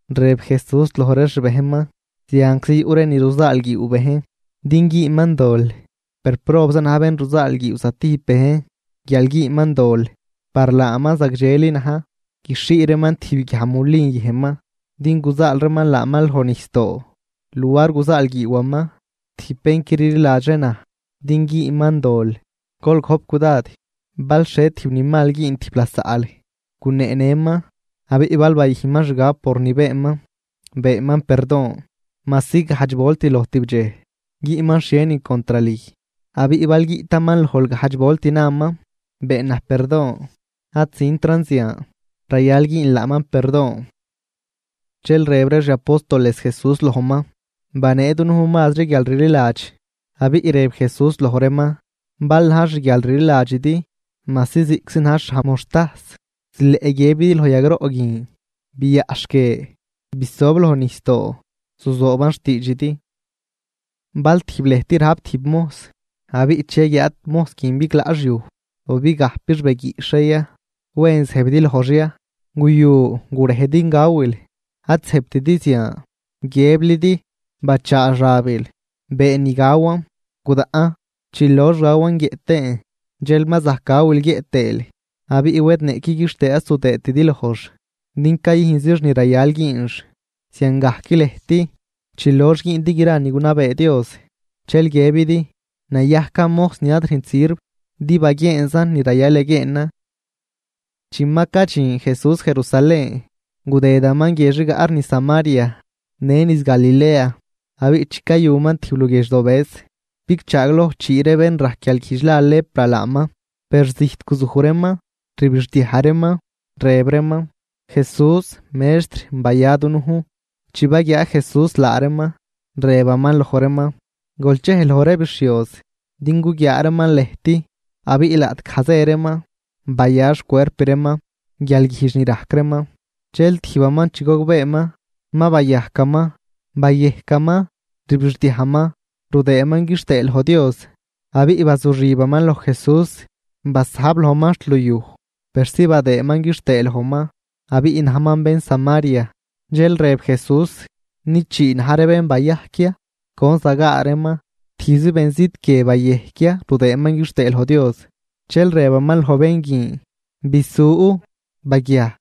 Rëb Jesús loj ree xbejnman: ―Zianczi yuꞌ ree ni ruzaalguiiw bejn din güünman dol, per ¡probza na̱j bén ruzaalguiiw zatijb bejn guial güünman dol! Par laaman zagdxeli na̱j guixhii reeman tijb guiaj mulin yëjnman din guzaal reeman laaman loj nijsdoo, luar guzaalguiiwaman tijb bén qui rliladxri naj din güünman dol. ¡Gol gojp cudad! ’Bal xhie tijb ni mal güün tijb lasaꞌl, guneenëman. Abiꞌ bal bayüjnman xgab por ni beenman, beenman perdon. Majsi gajdx volt loj tibdxej güünman xhienin contr lüj, abiꞌ bal guiꞌtaman lojl gajdx volt naman: “Been naj perdon ad züntran zian”, rayal güünl laaman perdon. Dxel rëb ree xi apóstoles Jesús lojman: ―Banee dunujn mazri guialrliladx. Abiꞌ rëb Jesús loj reeman: ―Bal na̱j xguialrliladxidi majsi ziꞌczi na̱j xhaj moxtajs, zileꞌ guiëbidi loj yagroꞌ guin: “Biaꞌxh guie, bisob loj nijsdoo”, zuzooban xtiidxidi. ’Bal tijb lëjt rajp tijb mojs, abiꞌ chi yaguiaad mojs guin biglaꞌx yuj o bigajpix beguiꞌxh ree ya, ¿wen zëjbidi lojx ya: “Guyu, gurej din gawil”? Ad zëjbtidi zian, guiëblidi: “Bachaa xabil, been ni gawan, gudaꞌn. Chi lox gawan guiëꞌ tëën dxel ma zajc gawil guiëꞌ tëël.” Abiꞌ wed niꞌqui quixtëë ad zudëëtidi lojx din cayüjnzix ni rayal güünx. Ziangajc lëjt chi loox güündi gra ni gunabee Dios dxel guiëbidi: “Nayajcan mojs ni ad rüjnt sirv, din baguieenzan ni rayal yaguieenan.” Chi ma cadxin Jesús Jerusalén, gudëdaman guiedx rigaꞌ ree niz Samaria në niz Galilea. Abiꞌ chi cayuman tijb luguiedx dobëz, bigchaagloj chii ree bén rajc guialguijdx la lepra laaman. Per zijt guzuj reeman, rbixdiaj reeman, rëb reeman: ―¡Jesús, Mextr, baya dunujn! Chi baguiaa Jesús laa reeman, rëbaman loj reeman: ―Gol chej loj ree bixhioz din guguiaa reeman lëjt. Abiꞌ laꞌtgaj zë reeman, baya xcuerp reeman guialguijdx ni rajc reeman. Dxel tijbaman chi gogbeeman ma bayajcaman, bayejcaman, rbixdiajman rudëëman quixtëë loj Dios. Abiꞌ bazuxibaman loj Jesús, basajb lojman xt luyuj persi badëëman quixtëë lojman. Abiꞌ najman bén Samaria. Dxel rëb Jesús: ―¿Nid chii na̱j ree bén bayajc ya? ¿Con zagaa reeman? ¿Tijbzi benzit guie bayejc ya rudëëman quixtëë loj Dios? Dxel rëbaman loj bén guin: ―Bisu. Baguiaj,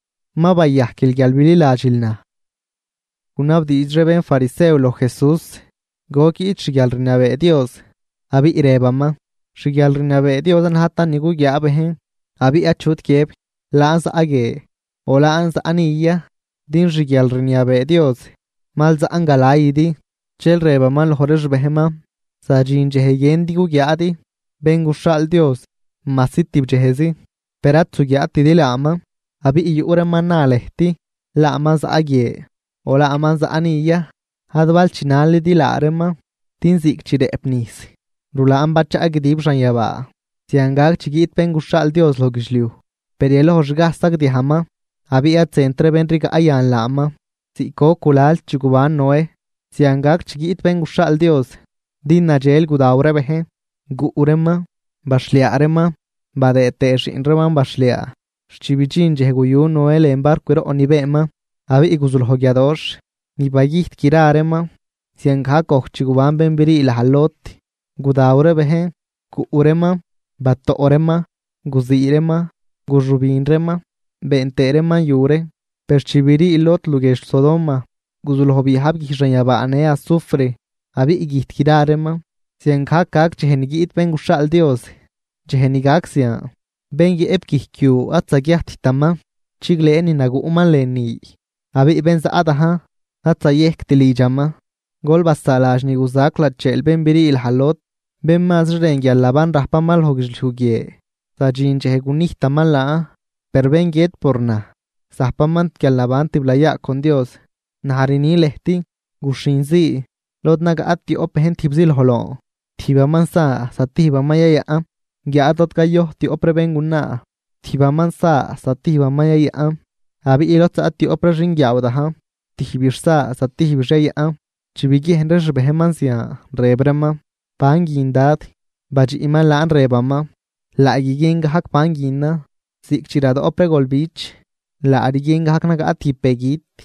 ma bayajquil guial bililadxil naj. Gunabdiidx ree bénfarisew loj Jesús goc guiꞌt xguialrniabee Dios, abiꞌ rëbaman: ―Xguialrniabee Dios ad najtan ni guguiaa bejn. Abiꞌ achut guiëb: “Laan zaꞌ guie”, o “Laan zaꞌ ni” ya, din xguialrniabee Dios mal zaꞌn galaydi. Dxel rëbaman loj ree xbejnman: ―Zadxin dxej guiëndi guguiaadi Bén guxhaal Dios majsi tibdxejzi, per ad zuguiaatidi laaman. Abiꞌ yuꞌ reeman na lëjt: “Laaman zaꞌ guie”, o “Laaman zaꞌ ni” ya, ad bal chinalidi laa reeman. Din ziꞌc chi rëꞌp nijs rulaan bachaꞌ guidib xanyabaa, zian gac chi guiꞌt Bén guxhaal Dios loj guidxliuj. Per yalojxgaj sagdiajman abiꞌ ad zënt ree bén rigaꞌ yan laaman. Ziꞌc goc gulal chi guban Noé, zian gac chi guiꞌt Bén guxhaal Dios. Din nadxel gudaw ree bejn, guꞌ reeman, baxhliaa reeman badëë tëë xiꞌn reeman baxhliaa xt chi bidxin dxej guyu Noé lën barcwroꞌ ni beenman, abiꞌ guzuloj guiadoxh ni bagüjt gra reeman. Ziangajc gojc chi guban bén brii laj Lot, gudaw ree bejn, guꞌ reeman, batoꞌ reeman, guzii reeman, guxübin reeman been tëë reeman yu ree. Per chi brii Lot luguiedx Sodoma, guzuloj biyajb guij xanyabaa në azufre, abiꞌ güjt gra reeman. Ziangajc gac dxej ni guiꞌt Bén guxhaal Dios. ’Dxej ni gac zian, bén yëꞌp guijc yu ad zaguiajttaman chiglëë ni naguꞌman lënü. Abiꞌ bén zaꞌ dajn, ad zayejct lidxaman. Gol basaaladx ni guzac lacheel bén brii laj Lot. Bén mazri rën guialnaban rajpaman loj guidxliuj guie, zadxin dxej gunijtaman laan, per bén guiët por naj, zajpaman guialnaban tiblayaa con Dios. ’Naj rni lëjt, guxhinzii lod nagaꞌ tioꞌp bejn tijbzi loj loon, tijbaman sa zatijbaman yayaꞌn. Guiáad lod cayojt tioꞌp ree béngunaa, tijbaman sa zatijbaman yayaꞌn. Abiꞌ lod zaꞌ tioꞌp ree xinguiaaw dajn, tijbix sa zatijbix yayaꞌn. Chi biguiejn ree xbejnman zian, rëb reeman: ―¿Ban guin, Dad? Badxiꞌman laan rëbaman: ―Laa guiguien gajc ban guinan, ziꞌc chi radoꞌp ree golbich laa rguien gajc nagaꞌ tijb begüt.